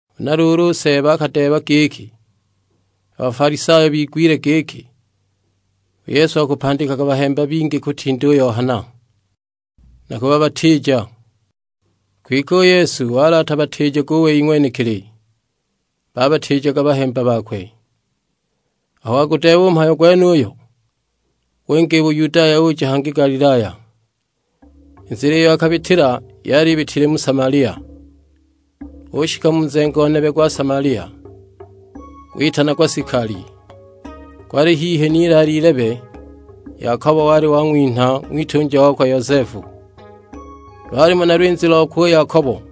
Huna luulu, u Seeba akadeeba giki, a Bafalisayo bigwile giki u Yesu akupandikaga bahemba bingi kutinda u Yohana, na kubabatiija. Kwike u Yesu wali atabatiijaga u wei ng'wenekili, babatiijaga bahemba bakwe. Aho wagudeeba u mhayo gwenuyo, winga i Buyudaya uja hangi Galilaya. I nzila iyo akabitila yali ibitile mu Samalia. Ushika mu nzengo nebe gwa Samalia, gwitanagwa Sikali, gwali hihi n'ilaale ilebe, Yakobo wali wang'winha ng'witunja wakwe Yosefu. Lwalimo na lwinzi lokwe u Yakobo.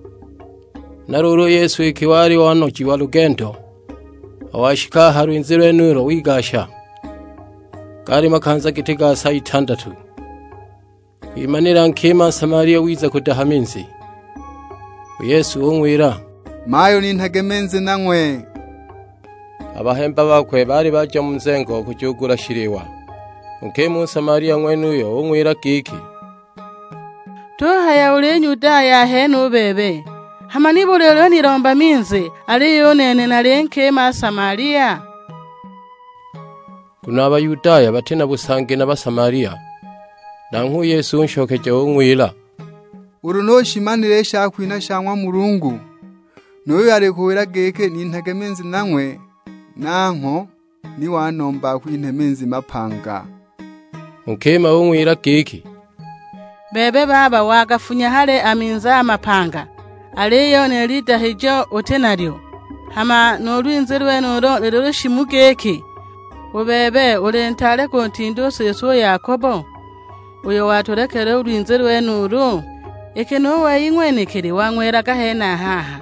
Huna luulu u Yesu iki wali wanojiwa lugendo, aho washika a ha lwinzi lwenulo wigasha; gaali makanza giti ga sa itandatu. Kwimanila nkima Nsamalia wiza kudaha minzi; u Yesu ung'wila, "Mayu ninhage minzi nang'we." A bahemba bakwe baali baja mu nzengo kujugula shiliwa. U nkima u Nsamalia ng'wenuyo ung'wila giki, "Tuhaya uli Nyudaya ahene u bebe, hama nibuli ulinilomba minzi, aliyo u nene nali nkima Nsamalia?" (Nguno a Bayudaya bati na busangi na Basamalia). Nanghwe u Yesu unshokeja ung'wila, "Ulu ni ushimanile i shakwinha sha ng'wa Mulungu, nu yuyo alikuwila giki, 'Ninhage minzi nang'we,' nangho ni wanomba akwinhe minzi mapanga." U nkima ung'wila giki, "Bebe baba wagafunya hali a minzi a mapanga, aliyo ni lidahijo uti nalyo; hama nu lwinzi lwenulu lushimu giki? U bebe uli ntaale kunkila u siswe u Yakobo, uyo watulekela u lwinzi lwenulu? Iki nu wei ng'wenekili wang'welaga henaha aha,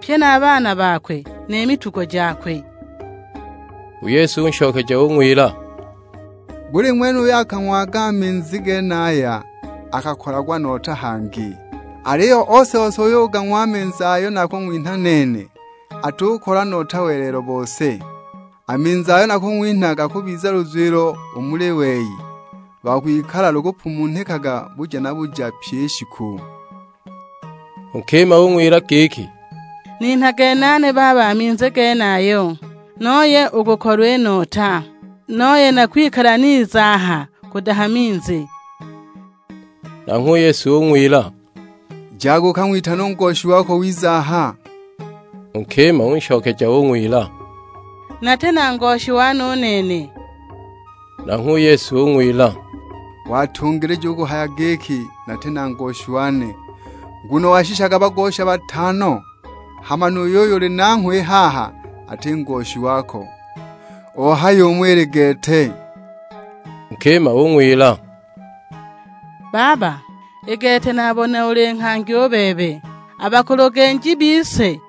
pye na a baana bakwe, ni mitugo jakwe!" U Yesu unshokeja ung'wila, "Buli ng'wene uyo akagang'waga a minzi genaya akakolagwa nota hangi. Aliyo ose-ose uyo ugang'wa a minzi ayo nakung'winha nene, atukolwa nota welelo bose, a minzi ayo nakung'winha gakubiza luzwilo u muli wei, lwa kwikala lukupumunhikaga buja na buja pyi i shiku." U nkima ung'wila giki, "Ninhage nane baba a minzi genayo, nooye u kukolwa i nota, nooye na kwikala niza aha kudaha minzi!" Nanghwe u Yesu ung'wila, "Jaga ukang'witane u ngoshi wako ng'wize aha." U nkima unshokeja ung'wila, "Nati na ngoshi wane u nene." Nanghwe u Yesu ung'wila, "Watungilija u kuhaya giki, 'Nati na ngoshi wane.' Nguno washishaga bagosha batano, hama nu yuyo uli nanghwe i haha ati ngoshi wako. Ohaya umo ili gete!" U nkima ung'wila, "Baba, i gete nabona uli nghangi u bebe. A bakulugenji bise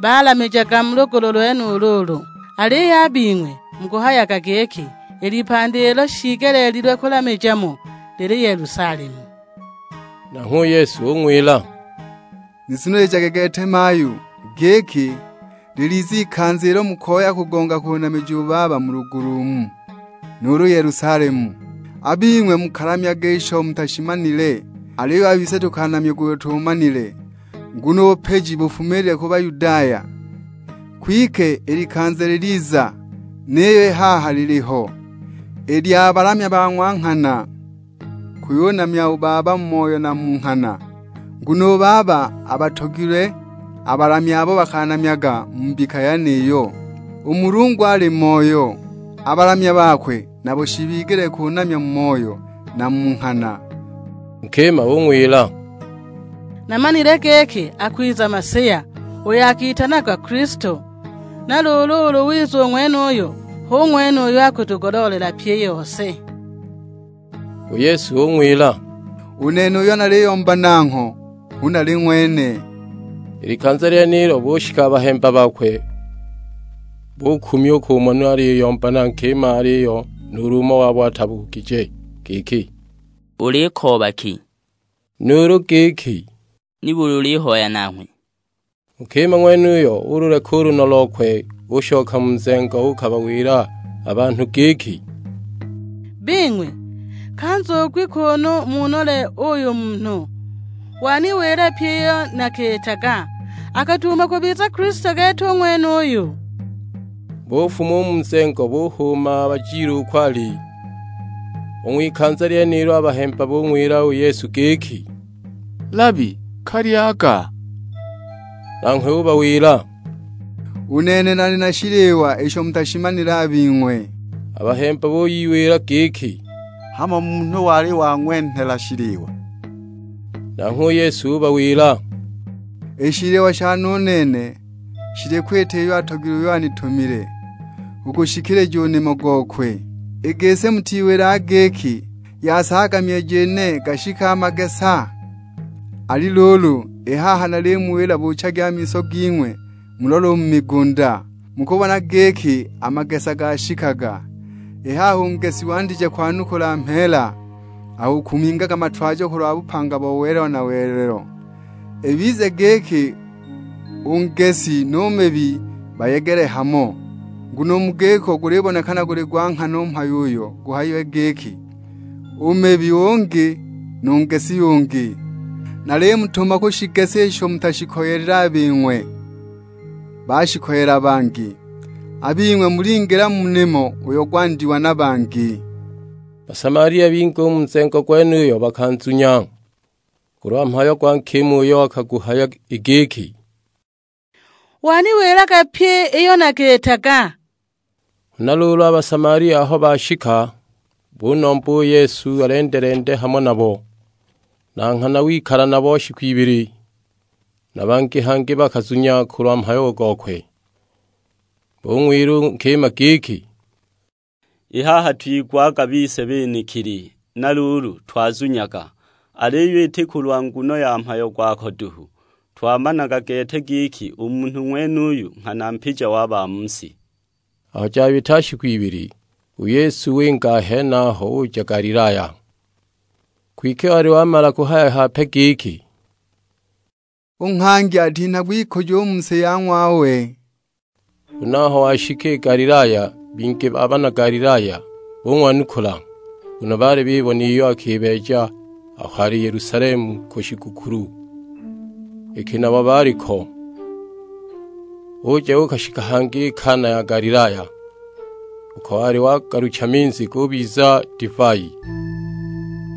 balamijaga mu lugulu lwenulu ulu, aliyo a bing'we mukahayaga giki i lipandi ilo shiigeleelilwe kulamija mo lili Yelusalemu!" Nanghwe u Yesu ung'wila, "Nizunilijage gete mayu; giki, liliza ikanza ilo mukoya kugonga kunamija u Baba mu lugulu umu, nuulu Yelusalemu. A bing'we mukalamyaga isho mutashimanile, aliyo a bise tukanamyaga uyo tuumanile; nguno u bupiji bufumile ku Bayudaya. Kwike i likanza liliza, niyo i haha liliho, i lya balamya ba ng'wa nghana kuyunamya u Baba mu moyo na mu nghana; nguno u Baba abatogilwe a balamya abo bakanamyaga mu mbika yeniyo. U Mulungu ali Moyo, a balamya bakwe nabo shibigelile kunamya mu moyo na mu nghana." U nkima ung'wila, "Namanile giki akwiza Masiya, uyo akitanagwa Kilisto, na luulu ulu wiza u ng'wenuyo, hu ng'wene uyo akutugoloolela pyi i yose." U Yesu ung'wila, "U Nene uyo naliyomba nangho, hu nali ng'wene." I likanza lyenilo bushika a bahemba bakwe, bukumya u kumona aliyomba na nkima. Aliyo nuulu umo wabo atabugije giki, "Ulikooba ki?" Nuulu giki, "Nibuli ulihoya nanghwe?" U nkima ng'wenuyo ululeka u lunno lokwe ushoka mu nzengo uukabawila a banhu giki, "Bing'we, ka nzugi kuunu munole uuyu munhu, waniwila pyi iyo nakiitaga; akuduuma kubiza Kilisto gete u ng'wenuyu?" Bufuma u mu nzengo buhuuma bajile uko wali. U ng'wikanza lyenilo a bahemba bung'wila u Yesu giki, "Labi, ka lyaga!" Nanghwe ubawila, "U nene nali na shiliwa isho mutashimanile a bing'we." A bahemba buyiwila giki, "Hamo munhu wali wang'wenhela shiliwa?" Nanghwe u Yesu ubawila, "I shiliwa shane u nene, shili kwita iyo atogilwe uyo anitumile; kugushikilija u nimo gokwe. I gisi mutiwilaga giki, 'Yasaagaga myeji ine gashike magesa?' Ali luulu, i haha nalimuwila buuchagi a miso ging'we, mulole u mu migunda, mukubona giki a magesa gashikaga. I haha u ngesi wandije kwanukula mheela, akukumingaga matwajo kulwa bupanga bo welelo na welelo; ibize giki u ngesi nu mibi bayegele hamo. Nguno u mu giko gulibonekana guli gwa nghana u mhayo uyo guhayile giki, 'U mibi ungi, nu ngesi ungi.' Nalimutuma kushigesa isho mutashikoyelile a bing'we, bashikoyela bangi; a bing'we mulingila mu nimo uyo gwandiwa na bangi." Basamalia bingi u mu nzengo gwenuyo bakanzunya, kulwa mhayo gwa nkima uyo akaguhaya; i giki, "Waniwilaga pyi iyo nakiitaga." Huna luulu a Basamalia aho bashika, bunomba u Yesu alende-lende hamo nabo; na nghana wikala nabo shiku ibili. Na bangi hangi bakazunya kulwa mhayo gokwe. Bung'wila u nkima giki, "I haha twigwaga bise benekili, na luulu twazunyaga; aliyo iti kulwa nguno ya mhayo gwako duhu, twamanaga gete giki u munhu ng'wenuyu nghana Mpija wa ba mu si." Aho jabita shiku ibili, u Yesu winga a henaho uja Galilaya. Kwike wali wamala kuhaya hape giki, "U nghangi atinhagwa ikujo u mu si ya ng'wawe!" Huna aho washika i Galilaya bingi ba bana Galilaya bung'wanukula, nguno baali bibona iyo akibeeja aho ali Yelusalemu ku shigukulu, iki nabo baali ko. Uja uukashika hangi i Kana ya Galilaya, uko wali wagalucha minzi gubiza divai.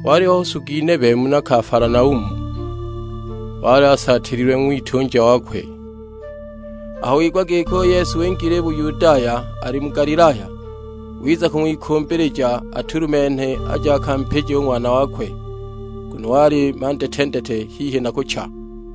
Waliho nsugi nebe muna Kafalanaumu, wali asaatililwe ng'witunja wakwe. Aho wigwa giki u Yesu wingile i Buyudaya, ali mu Galilaya, wiza kung'wikumbilija atulumenhe, aje akampije u ng'wana wakwe. Nguno wali mandetendete, hihi na kucha!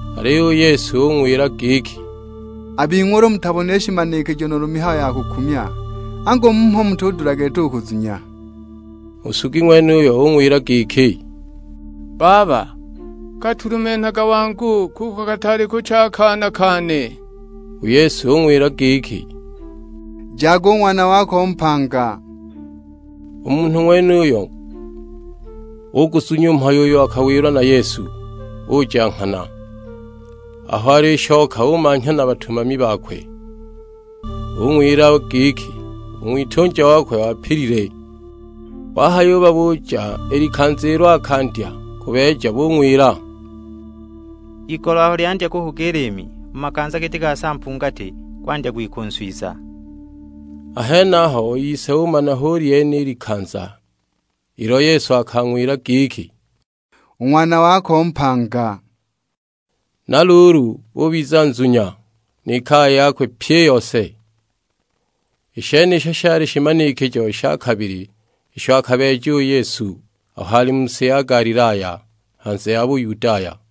Aliyo u Yesu ung'wila giki, "A bing'we ulu mutabonile shimanikijo nuulu mihayo ya kukumya, angu mmho mutudula gete u kuzunya!" U nsugi ng'wenuyo ung'wila giki, "Baba, ka tulumenhaga wangu, kuko kataali kucha a kana kane!" U Yesu ung'wila giki, "Jaga, u ng'wana wako mpanga." U munhu ng'wenuyo uguzunya u mhayo uyo akawilwa na Yesu, uja nghana. Aho alishoka umanhya na batumami bakwe, bung'wila giki u ng'witunja wakwe wapilile. Wahayubabuja i likanza ilo akandya kubeeja, bung'wila, "Igolo aho lyandya kuhuga i liimi; mu makanza giti ga sa mpungati, gwandya kwika u nswiza." A henaho u ise umana hu lyene i likanza ilo Yesu akang'wila giki, "U ng'wana wako mpanga." Na luulu ubiza nzunya, ni kaya yakwe pyi i yose. I shenisho shali shimanikijo sha kabili isho a kabeeja u Yesu aho ali mu si ya Galilaya, hanze ya Buyudaya.